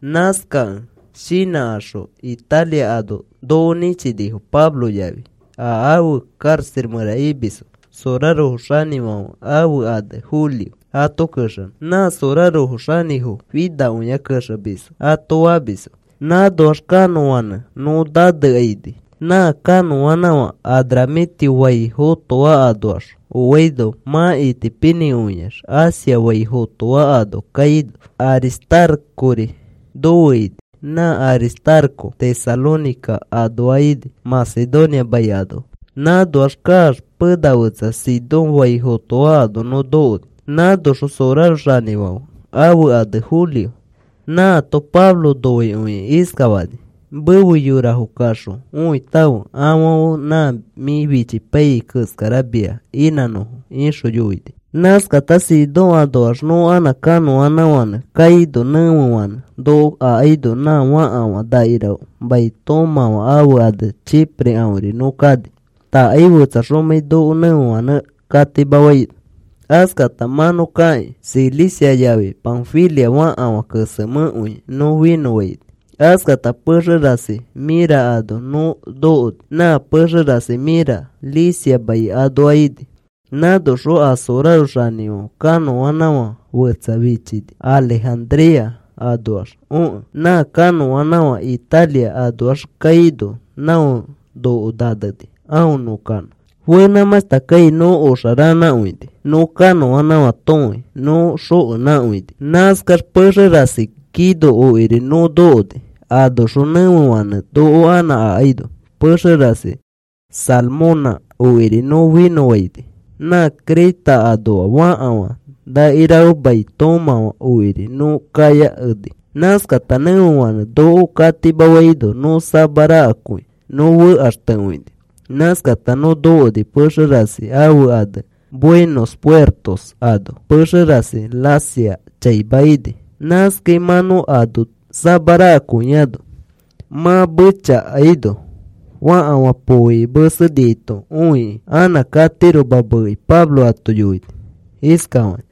Nãskakẽ shinãkaxõ Italia ano noko nĩchinifo. Pablo yafi a afe karaxa mẽra imisfo soraro xanĩfãfe ãfe ane Julio ato kexenõ. Nã sorarofo, “Xanĩfo finakõia kexemisfo,” ato famisfo. Nãnoax kanõanãfãnẽ nõ nanekaini. Nã kanõanãfã Adramitio fai fotoa anoax oaino mã itipinĩkõiax Asia fai fotoa ano kaino. Aristarcori nofe ini, nã Aristarco Tesalónica anoa ini, Macedonia mai anoa. Nãnoax kaax pena fetsa Sidón fai fotoa ano nõ nokoni. Nãnoxõ soraro xanĩfãfe ãfe ane Julio nãato Pablo noikõikĩ iskafani: “Mefe yorafo kaxõ õitãfe afãfe nã mĩ fichipaiyai keskara mia inãnõfo,” ixõ yoini. Nãskata Sidón anoax nõ anã kanõanãfãnẽ kaino, nẽfefanẽ noko akaino nã fakafã nakirafe mai toomãfã ãfe ane Chipre aõri nõ kani, takai fetsaxomãi noko nẽfefanẽ katimafaino. Askata mã nõ kakĩ Cilicia yafi Panfilia fakafã kesemẽkõi nõ finõfaini. Askata pexe rasi Mira ano nõ nokoni. Nã pexe rasi Mira Licia mai anoa ini. Nãnoxõ a soraro xanĩfãfe kanõanãfã fetsa fichini Alejandría anoax okẽ. Nã kanõanãfã Italia anoax kaino, não noko naneni aõ nõ kanõ. Fenãmãshta kai nõ oxa ranãkõini, nõ kanõanãfã tõfei nõ xokenãkõini. Nãskax pexe rasi Gnido okiri nõ nokoni. Anoxõ nẽfefãnẽ noko anã akaino, pexe rasi Salmona okiri nõ finõfaini. Nã Creta anoa fakafã nakirafe mai toomãfã okiri nõ kayakeni. Nãskata nẽfefãnẽ noko katimafaino nõ samarakakõi nõ fekaxtekõini. Nãskata nõ nokoni pexe rasi ãfe ane Buenos Puertos ano. Pexe rasi Lasea chaima ini. Nãskai mã nõ ano samarakõiano, mã mechakaino fakafã pooiki meseniaito õikĩ anã katiroma meeki Pablo ato yoini iskafakĩ: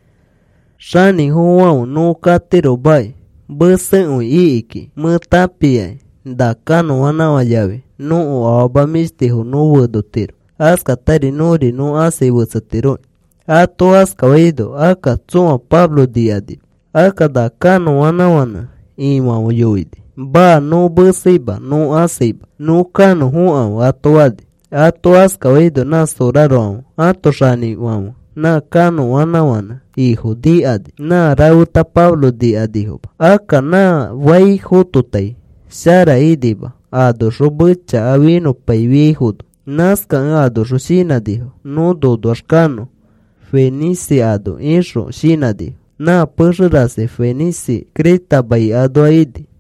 “Xanĩfofofãfe, nõ katiromaki mesekõi iki kiki mẽ tãpiaki. Na kanõanãfã yafi nõko afama mĩshtifo nõ fenotiro, askatari nõri nõ ãsai fetsetiroki,” ato faino akka tsõa Pablo nikanima. Akka na kanõanãfãnẽ ifãfe yoini: “Maa. Nõ meseima, nõ ãsaima. Nõ kanõ fokãfe,” ato fani. Ato askafaino nã sorarofãfe ãto xanĩfãfe nã kanõanãfãnẽ ifo nikani. Nã rafeta Pablo nikanifoma. Akka nã fai fototai shara inima anoxõ mechaka finõpaifiaifono nãskakẽ anoxõ shinãnifo: “Nõ nonoax kanõ Fenice ano,” ixõ shinãnifo. Nã pexe rasi Fenice Creta mai anoa ini.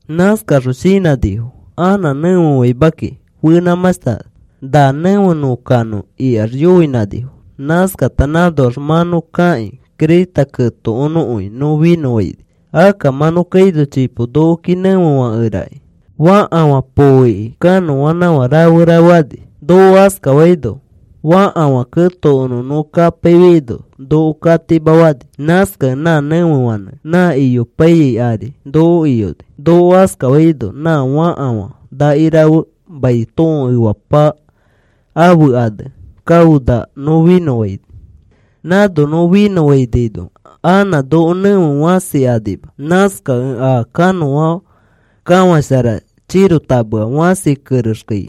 Nãskaxõ shinãnifo: “Anã nẽfefaima kiki, fenãmãshta nefei kiki na nẽfe nõ kanõ,” ikax yoinãnifo. Nãskata nãnoax mã nõ kakĩ Creta ketokonõkõi nõ finõfaini. Akka mã nõ kaino chipo nokoki nẽfefãkerakĩ, fakafã pooiki kanõanãfã rafe rafe ani. Noko askafaino fakafã ketokonõ nõ kapaifiaino, noko katimafani. Nãskakẽ nã nẽfefanẽ nã iyopaiyai ari noko iyoni. Noko askafaino nã fakafã nakirafe mai tõo efapama ãfe ane Cauda nõ finõfaini. Nãno nõ finõfainaino anã noko nẽfe fãsi anima. Nãskakẽ a kanõa kafãshara chirotamea fãsi kerexkai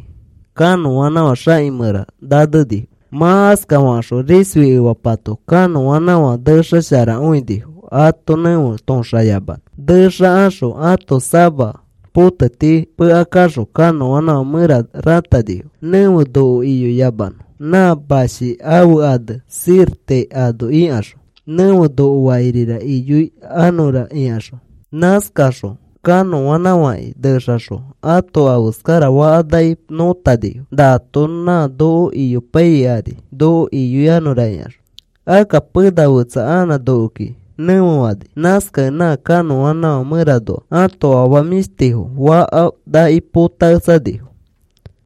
kanõanãfã xaki mẽra nanenifo. Mã askafakaxõ risfi efapato kanõanãfã nexasharakõinifo ato nẽfe toõxayamanõ. Nexakaxõ ãto sama poteti pekakaxõ kanõanãfã mẽra rãtanifo, nẽfe noko iyoyamanõ nã mashi ãfe ane Sirte ano ikaxõ, “Nẽfe noko fakirira iyoikanõra,” ikaxõ. Nãskakaxõ kanõanãfãki nexakaxõ ãto afeskarafakafãnaki nõtanifo, nato nã noko iyopaiyai ari noko iyoikanõra ikaxõ. Akka pena fetsa anã nokoki nẽfefani, nãskakẽ nã kanõanãfã mẽranoa ãto afama mĩshtifo fakafã naki potaketsanifo.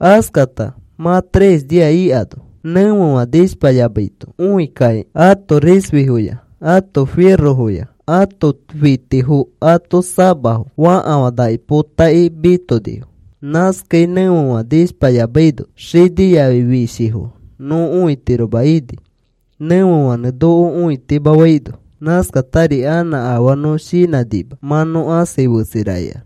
Askakãta mã tres nia ikano nẽfefã nishpayamaito õi kakĩ ãto risfifoya ãto firofo, ãto fitifo, ãto samafo, fakafã naki potakĩ mitonifo. Nãskai nẽfefã nishpayamaino xini yafi fishifo nõ õitiroma ini, nẽfefanẽ noko õitimafaino. Nãskatari anã afaa nõ shinãnima mã nõ ãsai fetseira ikax.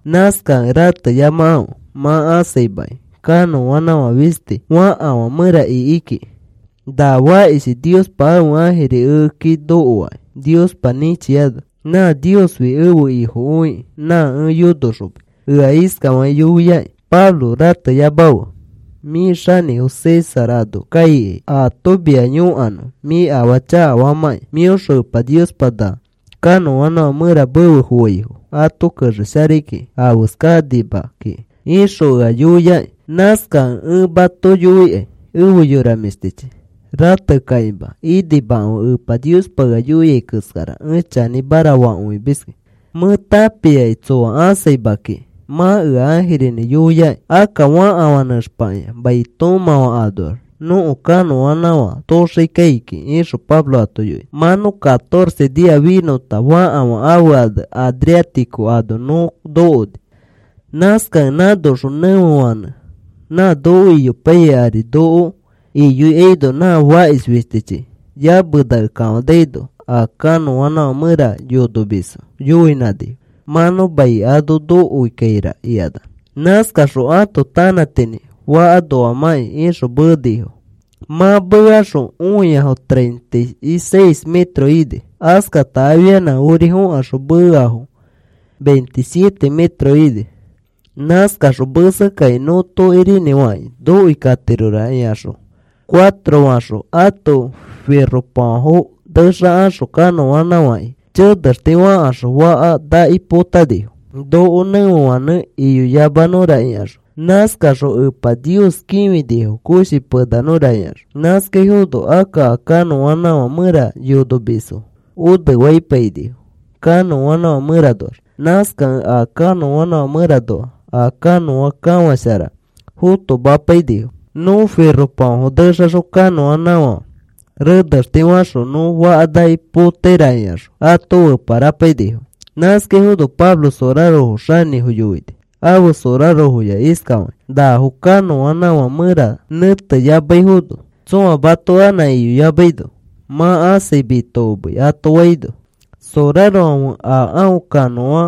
Nãskakẽ rateyamakãfe. Mã ãsaimakai. Kanõanãfã fisti fakafã mẽra iki kiki. Na fakishi Niospa ãfe ãjiri ekeki nokoakĩ Niospa nĩchiano, nã Niosfi ẽfe Ifokõikĩ, nã ẽ yonoxomis. Ea iskafakĩ yoiakĩ: ‘Pablo, rateyamafe. Mĩ xanĩfo César ano kaikai ato mia yõkanõ mĩ afaa chakafamãkĩ. Mĩoxõ Epa Niospa na kanõanãfã mẽra mefe foaifo ato kexesharai kiki afeskakanima kiki,’ ixõ ea yoiaki. Nãskakẽ ẽ mato yoikai efe yora mĩshtichi, ratekakima inimakãfe. Epa Niospa ea yoiai keskara ẽ chanĩmara fakõimiski. Mẽ tãpiaki tsoa ãsaima kiki mã ea ãjirinĩ yoiaki. Akka fakafã nẽxpakĩa mai toomãfã anoax nõko kanõanãfã tooxai kiki,” ixõ Pablo ato yoini. Mã nõ catorce nia finõta fakafã ãfe ane Adriático ano nõ nokoni. Nãskakẽ nãnoxõ nẽfefanẽ nã noko iyopaiyai ari noko iyoikaino, nã fakish fistichi yamenake kafanaino a kanõanãfã mẽra yonomisfo yoinãnifo: “Mã nõ mai ano nokoikaira,” ikanax. Nãskakaxõ ãto tanãtinĩ faka noamãkĩ ixõ meenifo. Mã meekaxõ õiafo treinta y seis metros ini, askata afianã ori fokaxõ meeafo veintisiete metros ini. Nãskakaxõ mesekakĩ nõ tokirinĩfakĩ nokoi katirora ikaxõ, cuatro faxõ ãto firopafãfo nexakaxõ kanõanãfãki chenexti fakaxõ fakafã naki potanifo, noko nẽfefanẽ iyoyamanõra ikaxõ. Nãskakaxõ Epa Nios kĩfinifo koshi penanõra ikaxõ. Nãskaifono akka a kanõanãfã mẽra yonomisfo onefaipainifo kanõanãfã mẽranoax. Nãskakẽ a kanõanãfã mẽranoa a kanõa kafãshara fotomapainifo. Nõ firopafãfo nexaxõ kanõanãfã renexte faxõ nõ fakanaki potaira ikaxõ ato feparapainifo. Nãskaifono Pablo soraro xanĩfo yoini, ãfe sorarofoya iskafakĩ: “Nafo kanõanãfã mẽra nẽteyamaifono tsõa mato anã iyoyamaino, mã ãsai mitokomei,” ato faino, sorarofãfe a aõ kanõa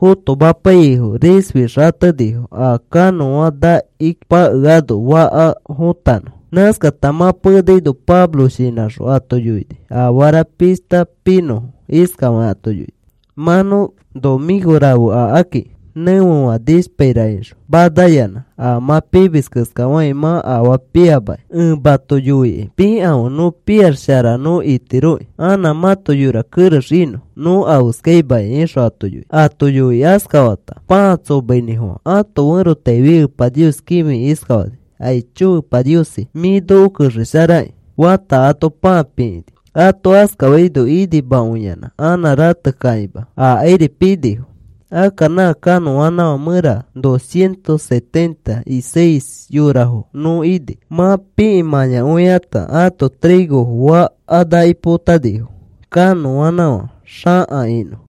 fotomapaiyaifo risfi xatenifo a kanõa fakanaki pakeano fãka fõtanõ. Nãskata mã penaino Pablo shinãxõ ato yoini afara pishta pinõfo. Iskafakĩ ato yoini: “Mã nõ nomĩko rafe akaki nẽfefã nishpaira ixõ, manayanã a mã pimis keskafakĩ mã afaa piamaki. Ẽ mato yoikai pikãfe. Nõ piax shara nõ itiroki anã mãto yora kerex inõ. Nõ afeskaimakai,” ixõ ato yoini. Ato yoikĩ askafata pãa tsomainĩfofã ãto ferotaifi, Epa Nios kĩfikĩ iskafani: “Aicho Epa Niosi, mĩ noko kexesharaki,” fata ato pãa pikĩni. Ato askafaino inimakõiyanã anã ratekakĩma akairi pinifo. Akka nã kanõanãfã mẽra docientos setenta y seis yorafo nõ ini. Mã pii mãyakõikãta ato trigofo fakafã naki potanifo, kanõanãfã xaka inõ.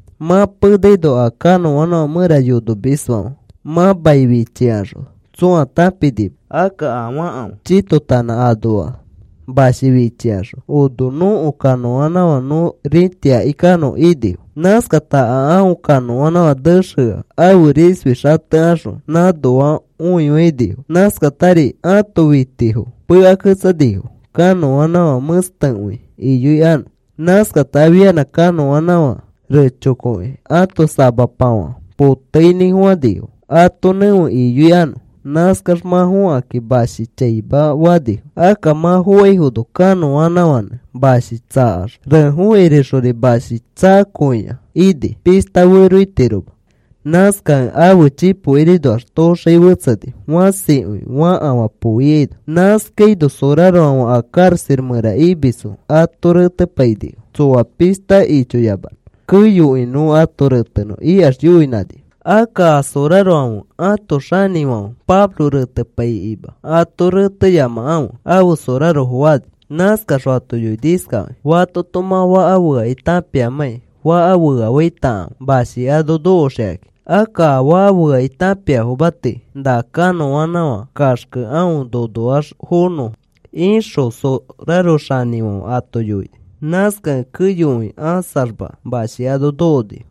Mã penaino a kanõanãfã mẽra yonomisfãfe, mã mai fichifikaxõ tsõa tãpinima. Akka a fakafã chitotanã anoa mashi fichikaxõ, “Ono nõko kanõanãfã nõ rĩtiaki kanõ,” inifo. Nãskakata a aõ kanõanãfã nexea ãfe risfi xatekaxõ nãnoa õifainifo. Nãskatari ãto fitifo pekaketsanifo kanõanãfã mẽstekõi iyoikanõ. Nãskata afianã kanõanãfã rechokoki ãto samapafã poteinĩfofãnifo ato nẽfe iyoikanõ. Nãskax mã fõkakĩ mashi chaima fanifo. Akka mã fofaifono kanõanãfãnẽ mashi tsakax nãno rakani. Refokirixori mashi tsakakõia ini, pishta feroitiroma. Nãskakẽ aõ chipokirinoax toxai fetseni fãsikõi fãkafã poo ikaino. Nãskaino sorarofãfe a karaxa mẽra imisfo ato retepainifo, tsoa pishta ichoyamanõ. “Keyokõi nõ ato retenõ,” ikax yoinãnifo. Akka a sorarofãfe ãto xanĩfãfe Pablo retepaikĩma, “Ato reteyamakãfe,” ãfe sorarofo fani. Nãskaxõ ato yoini iskafakĩ: “Fatoto mã faka feakĩ tãpiamãkĩ faka feafaitakãfe mashi ano nokoxikakĩ. Akka a faka feakĩ tãpiafoma tii na kanõanãfã kaxkẽ aõ nonoax fonõfo,” ixõ soraro xanĩfãfe ato yoini. Nãskakẽ keyokõi ãsaxma mashi ano nokonifo.